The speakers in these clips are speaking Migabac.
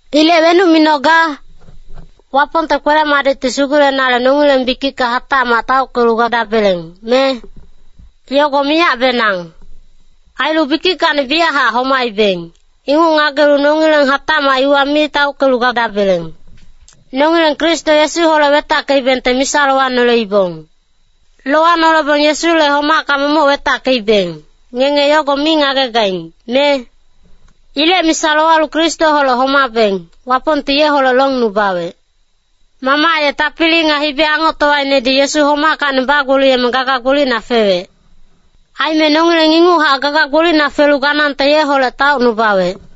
Ilec wenuc minoga? Wapongte kwele-madicti sugulenale nongileng bikicka hatacmac taockelu gadabeleng, me? Yogo miyacbenang. Ailu bikickacni biyachac homaibeng, inguc ngagelu nongileng hatacmac iwa mi taockelu gadabeleng. Nongileng Kristo Yesuholec wetackeibengte misa lowanoleibong. Lowanolebong Yesule homacka momoc wetackeibeng, ngenge yogo mi ngagegaing, me? Ilec misa lowalu Kristoholec homabeng, Wapongti yeholec longnubawec. Mamac ye tapili nga hibi-angoctowainedi Yesu homackacni bagboliyeme gaga gbolicna fewec. Aime nongileng inguchac gaga gbolicna felu ganangte yeholec taocnubawec.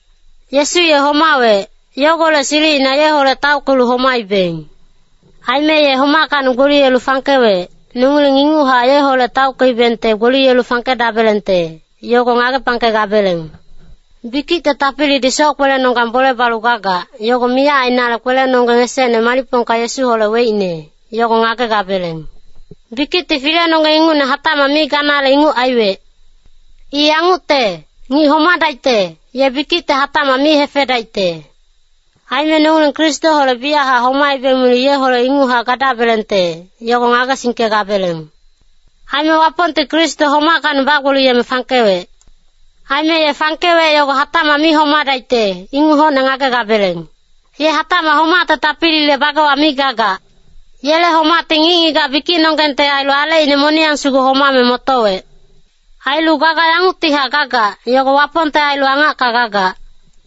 Yesu ye homawec, yogolec silicina yeholec taockelu homaibeng. Aime ye homackacni gboliyelu fangkewec, nongileng inguchac yeholec taockeibengte gboliyelu fangkedabelengte, yogo ngagepangkegabeleng. Bikicte tapilidi soc-kwelenonggang bole balu gagac, yogo miyac ainale kwelenonggeng esecne malicpongka Yesuholec weicne, yogo ngagegabeleng. Bikicti filenonggeng ingucne hatacmac mi ganale inguc aiwec. I yangucte, ngic homadaicte, ye bikicti hatacmac mi hefedaicte. Aime nongileng Kristoholec biyachac homaibeng milu yeholec inguchac gadabelengte, yogo ngagesingkegabeleng. Aime Wapongti Kristo homackacni bagboliyeme fangkewec. Aime ye fangkewec yogo hatacmac mi homadaicte, inguc hocne ngagegabeleng. Ye hatacmac homacte tapilile bagewa mi gagac. Yele homacti ngic-ngigac bikicnonggengte ailu alecine moniyang sugu homame motowec. Ailu gaga yanguctihac gagac, yogo Wapongte ailu angacka gagac.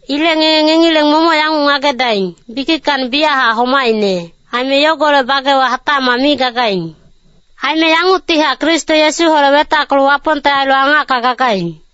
Ilec ngenge ngengileng momoc yanguc ngagedaing, bikickacni biyachac homaicne, aime yogolec bagewa hatacmac mi gagaing. Aime yanguctihac Kristo Yesuholec wetackelu Wapongte ailu angacka gagaing.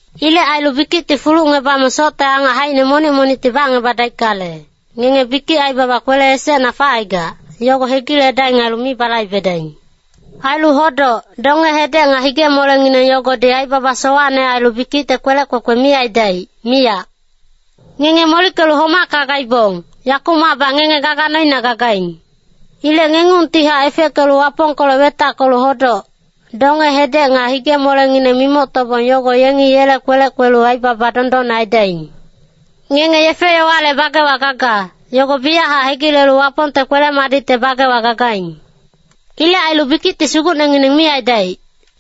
Ilec ailu bikicti fulucngebame socte angac haicine monic monicti bacngebadaickale, ngenge bikic aibaba kwele esecna facaigac, yogo hegiledaing ailu mi balaibedaing. Ailu hodoc, donge-hedec nga hige-molengineng yogodi aibaba sowacne ailu bikicte kwelec kwekwe mi aidaic, miyac. Ngenge molickelu homacka gaibong, yakumacbac ngenge gaga noina gagaing. Ilec ngengungtihac efeckelu Wapongkolec wetackelu hodoc, donge-hedec nga hige-molengineng mimoctobong yogo yengi yele kwelec kwelu aibaba dondonne aidaing. Ngenge yefe-yowale bagewa gaga, yogo biyachac hegilelu Wapongte kwele-madicte bagewa gagaing. Ilec ailu bikicti sugucnengineng mi aidaic.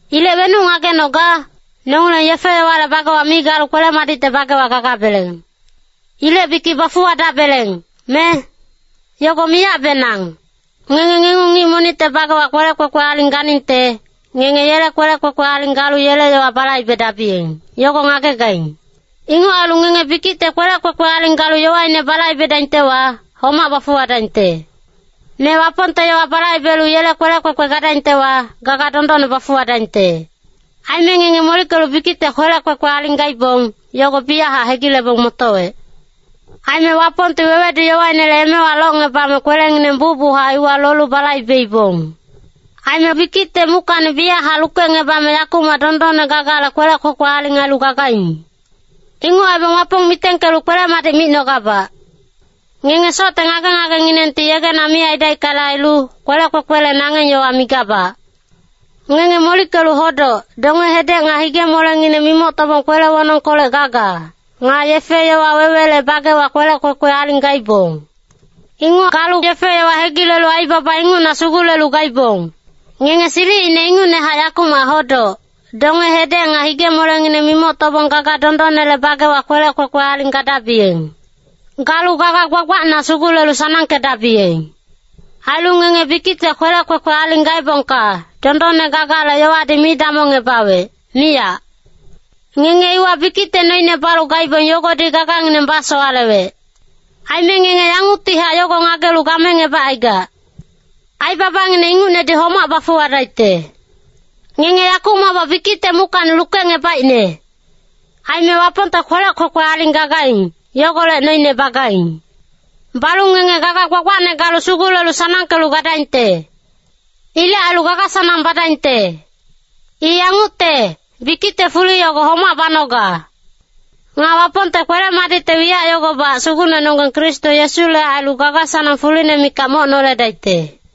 Ilec wenuc ngagenoga? Nongileng yefe-yowale bagewa mi galu kwele-madicte bagewa gagabeleng. Ilec bikic bafuwadabeleng, me? Yogo miyacbenang! Ngenge ngengung ngic monicte bagewa kwelec kwekwe aling ganingte, ngenge yele kwelec kwekwe aling galu yele yowa balaibedabiyeng, yogo ngagegaing. Inguc ailu ngenge bikicte kwelec kwekwe aling galu yowaine balaibedaingtewa, homac bafuwadaingte. Me Wapongte yowa balaibelu yele kwelec kwekwe gadaingtewa, gaga dondonne bafuwadaingte. Aime ngenge molickelu bikicte kwelec kwekwe aling gaibong, yogo biyachac hegilebong motowec. Aime Wapongti wewedu-yowainele emewa locngebame kwelengineng bucbuchac iwa lolu balaibeibong. Aime bikicte muckacni biyachac lukecngebame yakumac dondonne gagale kwelec kwekwe aling ailu gagaing. Inguc aibong Wapong mitengkelu kwele-madic micnogabac. Ngenge socte ngage-ngagenginengti yegena mi aidaickale ailu, kwelec kwekwele nangeng yowa migabac. Ngenge molickelu hodoc, donge-hedec nga hige-molengineng mimoctobong kwele wonongkolec gaga, nga yefe-yowa wewele bagewa kwelec kwekwe aling gaibong. Inguc galu yefe-yowa hegilelu aibaba ingucna sugulelu gaibong. Ngenge silicine ingucnehac yakumac hodoc, donge-hedec nga hige-molengineng mimoctobong gaga dondonnele bagewa kwelec kwekwe aling gadabiyeng. Galu gaga gbagbacna sugulelu sanangkedabiyeng. Ailu ngenge bikicte kwelec kwekwe aling gaebongka, dondonne gagale yowadi mi damongngebawec, miyac. Ngenge iwa bikicte noine balu gaibong yogodi gagangineng basowalewec. Aime ngenge yanguctihac yogo ngagelu gamengebacaigac. Aibabangineng ingucnedi homac bafuwadaicte. Ngenge yakumacbac bikicte muckacni lukecngebaicne. Aime Wapongte kwelec kwekwe aling gagaing, yogolec noine bagaing. Balu ngenge gaga gbagbacne galu sugulelu sanangkelu gadaingte. Ilec ailu gaga-sanang badaingte. I yangucte, bikicte fuli yogo homac banoga. Nga Wapongte kwele-madicte wiyac yogobac Sugucnenonggeng Kristo Yesule ailu gaga-sanang fuline mikac moc noledaicte.